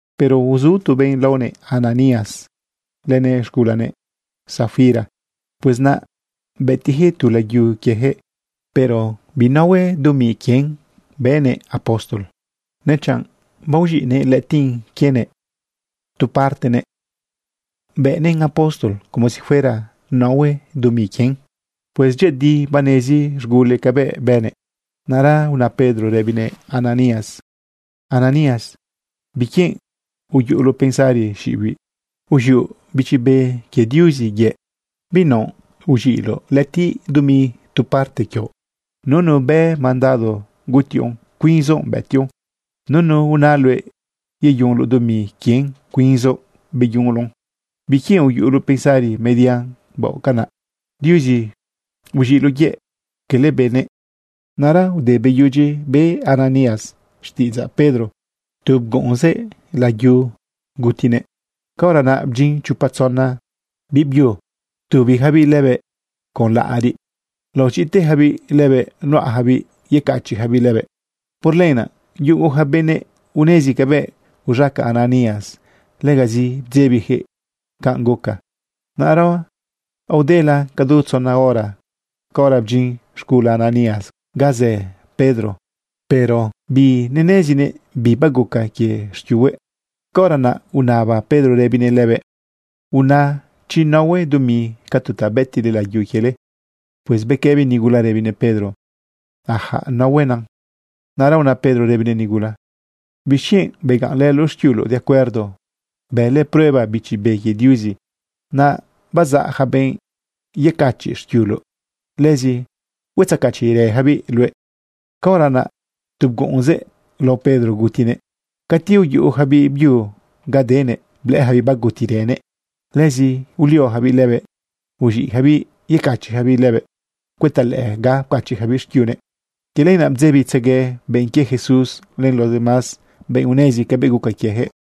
Pero uzu tu benꞌ laonëꞌ Ananías lënëꞌ z̃gulanëꞌ Safira. Pues naꞌ bëtiꞌyaquëꞌ tu layu quieyaquëꞌ. Pero binahue dumi quien bëꞌnëꞌ apóstol, nechanꞌ baoz̃iꞌnëꞌ lëꞌëtiꞌ quienëꞌ tu partenëꞌ bëꞌnëꞌn apóstol como si fuera nahue dumi quien. ―Pues dyëꞌëdi banezi z̃gulëꞌ cabëꞌ bënëꞌ. Naꞌra una Pedro rëbinëꞌ Ananías: ―Ananías, ¿biquienꞌ uyuꞌuloꞌ pensari xiꞌibiꞌ, uz̃ioꞌ Bichi Be quie Diuzi yëꞌ, binaoꞌ uz̃iꞌloꞌ lëꞌëtiꞌ dumi tu parte quioꞌ? Nunu bë mandado gutiꞌoꞌn, cuinzoꞌ bëtiꞌoꞌn. Nunu una luëꞌ yeyunloꞌ dumi quien, cuinzoꞌ beyunloꞌn. ¿Biquienꞌ uyuꞌuloꞌ pensari median, baoꞌ canaꞌ? Diuzi uz̃iꞌloꞌ yëꞌ, quele benëꞌ. Naꞌra ude beyudyi be Ananías xtiꞌidzaꞌ Pedro, tu bguꞌunzëꞌ layu gutinëꞌ. Caora naꞌ bdyin chopa tzona biꞌbyu ptubiyacabiꞌ lëbëꞌ con laꞌariꞌ laoz̃iꞌtejabiꞌ lëbëꞌ nuꞌajabiꞌ yecachiꞌyacabiꞌ lëbëꞌ. Por lenaꞌ yugo ja benëꞌ unezi cabëꞌ uz̃aca Ananías, legazi bdzebijëꞌ canꞌ guca. Naꞌra aodela cadu tzona hora, caora bdyin z̃gula Ananías ga zë Pedro. Pero binenezinëꞌ bi baguca quie xquiuhuëꞌ. Caora naꞌ unaba Pedro rëbinëꞌ lëbëꞌ: ―¡Una chi nahue dumi ca tu ta bëtiꞌle layu quiele! Pues bequëbi nigula rëbinëꞌ Pedro: ―Ajaꞌ, nahuena. Naꞌra una Pedro rëbinëꞌ nigula: ―¿Bixquienꞌ begaꞌnlëloꞌ xquiuloꞌ de acuerdo bële prueba Bichi Be quie Diuzi? Naꞌ bazaꞌ ja benꞌ yecachiꞌ xquiuloꞌ, lëzi huetzecachiꞌrëjabiꞌ luëꞌ. Caora naꞌ tu bguꞌunzëꞌ lao Pedro gutinëꞌ. Cati uyuꞌu ja biꞌbyu ga denëꞌ, blëꞌëyacabiꞌ bagutirënëꞌ. Lëzi uliojabiꞌ lëbëꞌ uz̃iꞌyacabiꞌ yecachiꞌyacabiꞌ lëbëꞌ cuëta lëꞌë ga pcachiꞌyacabiꞌ xquiunëꞌ. Quie lenaꞌ ptzebitzegue benꞌ quie Jesús len los demás benꞌ unezi cabëꞌ guca quieyaquëꞌ.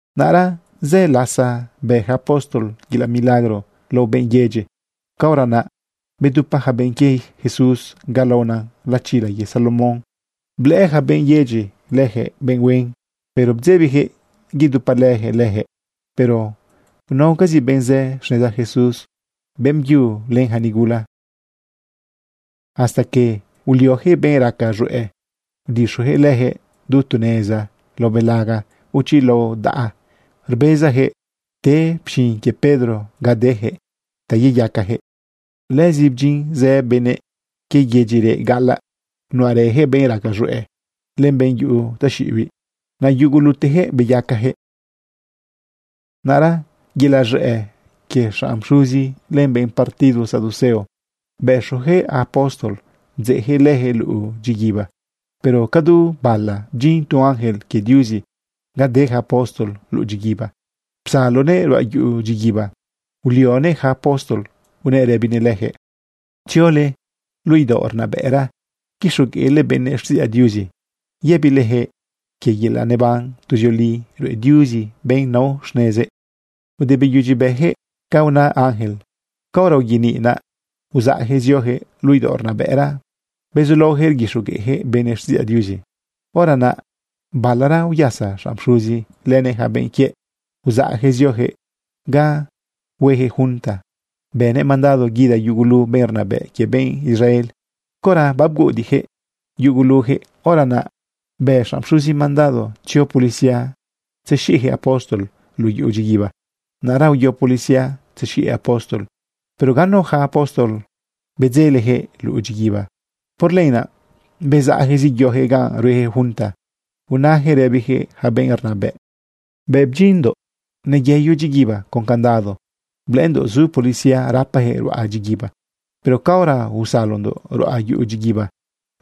Naꞌra zë lasa bë yaca apóstol yelaꞌ milagro lao benꞌ yedyi. Caora naꞌ bedupa yaca benꞌ quie Jesús ga laonan Lachila quie Salomón. Blëꞌë ja benꞌ yedyi leyaquëꞌ benꞌ huen, pero bdzebiyaquëꞌ yedupalëyaquëꞌ leyaquëꞌ. Pero unaocazi benꞌ zë xneza Jesús, beꞌmbyu len ja nigula. Hasta que ulioyaquëꞌ benꞌ raca z̃hueꞌ udixojëꞌ leyaquëꞌ du tu neza lao belaga o chi lao daꞌa. Rbezayaquëꞌ te pxin quie Pedro ga deyaquëꞌ ta yeyacayaquëꞌ. Lëzi bdyin zë benëꞌ quie yedyi reꞌ gaꞌalaꞌ, nuꞌarëyaquëꞌ benꞌ raca z̃hueꞌ len benꞌ yuꞌu taxiꞌibiꞌ. Naꞌ yugulutejëꞌ beyacayaquëꞌ. Naꞌra yelaꞌ z̃ëꞌ quie xanꞌ pxuzi len benꞌ partido saduceo, bëxoyaquëꞌ apóstol bdzeꞌyaquëꞌ leyaquëꞌ luꞌu dyiguiba. Pero ca du bala bdyin tu ángel quie Diuzi ga de ja apóstol luꞌu dyiguiba, psalonëꞌ ruꞌa yuꞌu dyiguiba, ulionëꞌ yaca apóstol unëꞌ rëbinëꞌ leyaquëꞌ: ―Tziole luꞌu idaoꞌ rnabëꞌra quixogueꞌle benëꞌ xtiꞌidzaꞌ Diuzi yëbilejëꞌ quie yelaꞌ neban tuzioli ruꞌe Diuzi benꞌ nao xnezëꞌ. Ude beyudyi beyaquëꞌ ca una ángel, caora uyeniꞌ naꞌ, uzaꞌyaquëꞌ zioyaquëꞌ luꞌu idaoꞌ rnabëꞌra bezulaoyaquëꞌ rguixogueꞌyaquëꞌ benëꞌ xtiꞌidzaꞌ Diuzi. Hora naꞌ balara uyasa xanꞌ pxuzi lënëꞌ yaca benꞌ quiëꞌ, uzaꞌyaquëꞌ zioyaquëꞌ ga hueyaquëꞌ junta bënëꞌ mandado guida yugulu benꞌ rnabëꞌ quie benꞌ Israel. Caora abguꞌudiꞌyaquëꞌ yuguluyaquëꞌ, hora naꞌ bë xanꞌ pxuzi mandado tzio policía tzexiꞌjëꞌ apóstol luꞌu yuꞌu dyiguiba. Naꞌra uyo policía tzexiꞌyaquëꞌ apóstol, pero ganu ja apóstol bedzeleyaquëꞌ luꞌu dyiguiba. Por lenaꞌ bezaꞌyaquëꞌ zeyoyaquëꞌ ganꞌ rueyaquëꞌ junta, unayaquëꞌ rëbiyaquëꞌ yaca benꞌ rnabëꞌ: ―Bëꞌ bdyindoꞌ neyeyo dyiguiba con candado, blëꞌëndoꞌ zu policía rapajëꞌ ruꞌa dyiguiba. Pero caora usalondoꞌ ruꞌa yuꞌu dyiguiba,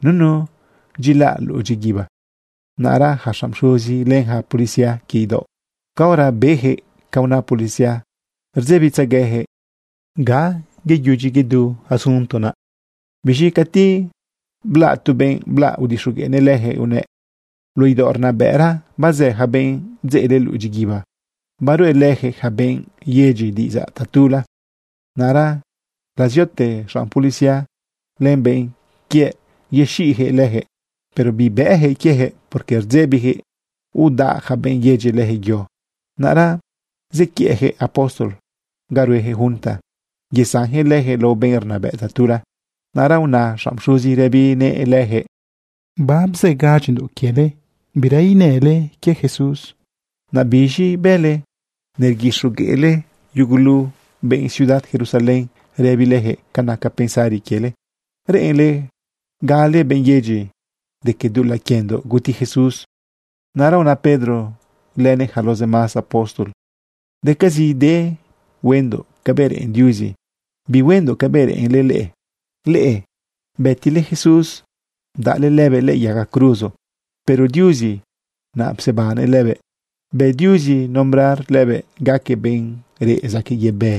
nunu dyilaꞌ luꞌu dyiguiba. Naꞌra yaca xanꞌ pxuzi len xanꞌ policía quie idaoꞌ, caora beyaquëꞌ ca una policía, rdzebitzegueyaquëꞌ ga yeyudyi yedu asunto naꞌ. Biz̃i cati blaꞌ tu benꞌ blaꞌ, udixogueꞌnëꞌ leyaquëꞌ unëꞌ: ―Luꞌu idaoꞌ rnabëꞌra bazë ja benꞌ bdzeꞌle luꞌu dyiguiba, baruꞌelëyaquëꞌ yaca benꞌ yedyi diꞌidzaꞌ tatula. Naꞌra laziote xanꞌ policía len benꞌ quiëꞌ yexiꞌyaquëꞌ leyaquëꞌ. Pero bibëꞌyaquëꞌ quieyaquëꞌ, porque rdzebiyaquëꞌ udaꞌ yaca benꞌ yedyi leyaquëꞌ yo. Naꞌra zequiëꞌyaquëꞌ apóstol ga rueyaquëꞌ junta yesanyaquëꞌ leyaquëꞌ lao benꞌ rnabëꞌ tatula. Naꞌra una xanꞌ pxuzi rëbinëꞌ leyaquëꞌ: ―Barzëgadyindoꞌ quiele bira inale quie Jesús. ¿Naꞌ biz̃i bële? Nerguixogueꞌle yugulu benꞌ ciudad Jerusalén rëbileyaquëꞌ ca naca pensari quiele, reꞌenle gale benꞌ yedyi de que dulaꞌ quiendoꞌ guti Jesús. Naꞌra una Pedro lënëꞌ yaca los demás apóstol: ―Decazide huendoꞌ cabëꞌ reꞌen Diuzi, bihuendoꞌ cabëꞌ reꞌenle leꞌe. Leꞌe bëtile Jesús bdaꞌle lëbëꞌ lëꞌë yaga cruzo, pero Diuzi naꞌ psebannëꞌ lëbëꞌ. Bë Diuzi nombrar lëbëꞌ gaquëꞌ benꞌ reꞌ zaquëꞌ yebë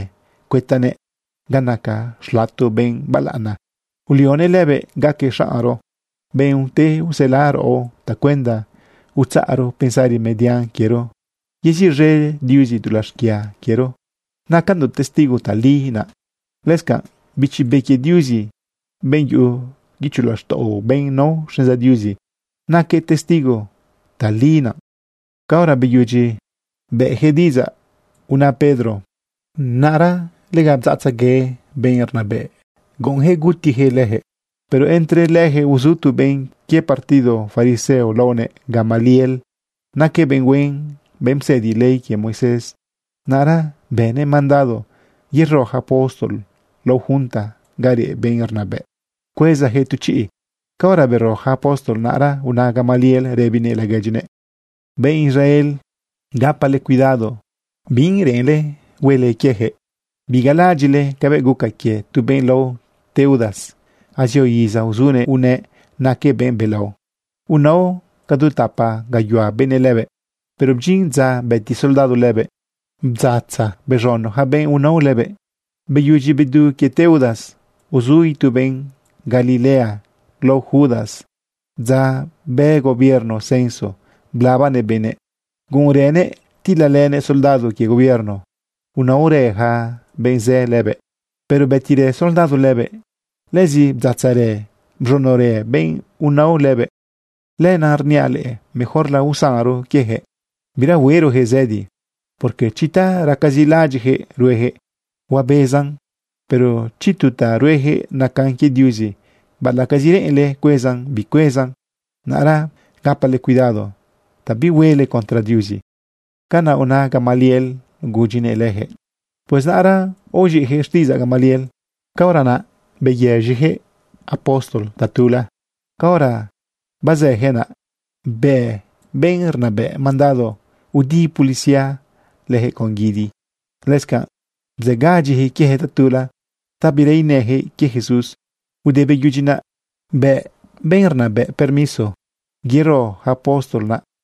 cuëtanëꞌ ga naca xlato benꞌ balaꞌana. Ulionëꞌ lëbëꞌ gaquëꞌ xaꞌnro, benꞌ ute usela raꞌo tacuenda utzaꞌro pensari median quiero yeziꞌz̃e Diuzi dulaꞌ xquia quiero. Nacandoꞌ testigo tali naꞌ. Lëscanꞌ Bichi Be quie Diuzi, benꞌ yuꞌu guicho laxtaꞌo benꞌ nao xneza Diuzi, naquëꞌ testigo tali naꞌ. Caora beyudyi beyaquëꞌ diꞌidzaꞌ una Pedro, naꞌra lega bdzaꞌtzegue benꞌ rnabëꞌ, guꞌunyaquëꞌ gutiyaquëꞌ leyaquëꞌ. Pero entre leyaquëꞌ uzu tu benꞌ quie partido fariseo laonëꞌ Gamaliel. Naquëꞌ benꞌ huen, benꞌ psëdi ley quie Moisés. Naꞌra bënëꞌ mandado yero ja apóstol lao junta ga reꞌ benꞌ rnabëꞌ cuezayaquëꞌ tu chiꞌ. Caora bero yaca apóstol, naꞌra una Gamaliel rëbinëꞌ laguedyinëꞌ: ―Benꞌ Israel, gapale cuidado bi reꞌenle huele quieyaquëꞌ. Bigalaꞌadyiꞌle cabëꞌ guca quie tu benꞌ lao Teudas. Azio iza uzunëꞌ unëꞌ naquëꞌ benꞌ belao. Unao ca du tapa gayuhua benëꞌ lëbëꞌ. Pero bdyin dza bëti soldado lëbëꞌ, bdzatza bez̃uno yaca benꞌ unao lëbëꞌ. Beyudyi bedu quie Teudas, uzu itu benꞌ Galilea lao Judas dza bë gobierno censo blabanëꞌ benëꞌ. Guꞌunrënëꞌ tilalënëꞌ soldado quie gobierno. Unaorë ja benꞌ zë lëbëꞌ, pero bëtirë soldado lëbëꞌ. Lëzi bdzatzarë bz̃unorë benꞌ unao lëbëꞌ. Lenaꞌ rniaꞌ leꞌe, mejorla usanro quieyaquëꞌ, bira huerojëꞌ zëdi. Porque chi ta racazi laꞌadyiꞌjëꞌ ruejëꞌ, huabezan. Pero chi tu ta rueyaquëꞌ nacan quie Diuzi, baꞌalaꞌcazi reꞌenle cuezan, bicuezan. Naꞌra gapale cuidado ta bihuele contra Diuzi. ―Canaꞌ una Gamaliel gudyinëꞌ leyaquëꞌ. Pues naꞌra aoz̃iꞌyaquëꞌ xtiꞌidzaꞌ Gamaliel. Caora naꞌ beyëz̃iyaquëꞌ apóstol tatula. Caora bazëyaquëꞌ naꞌ, bë benꞌ rnabëꞌ mandado udi policía leyaquëꞌ con guidi. Lëscanꞌ bzëgadyiyaquëꞌ quiejëꞌ tatula ta bira inëyaquëꞌ quie Jesús. Ude beyudyi naꞌ, bëꞌ benꞌ rnabëꞌ permiso yero ja apóstol naꞌ.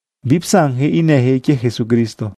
Bipsanyaquëꞌ inëyaquëꞌ quie Jesucristo.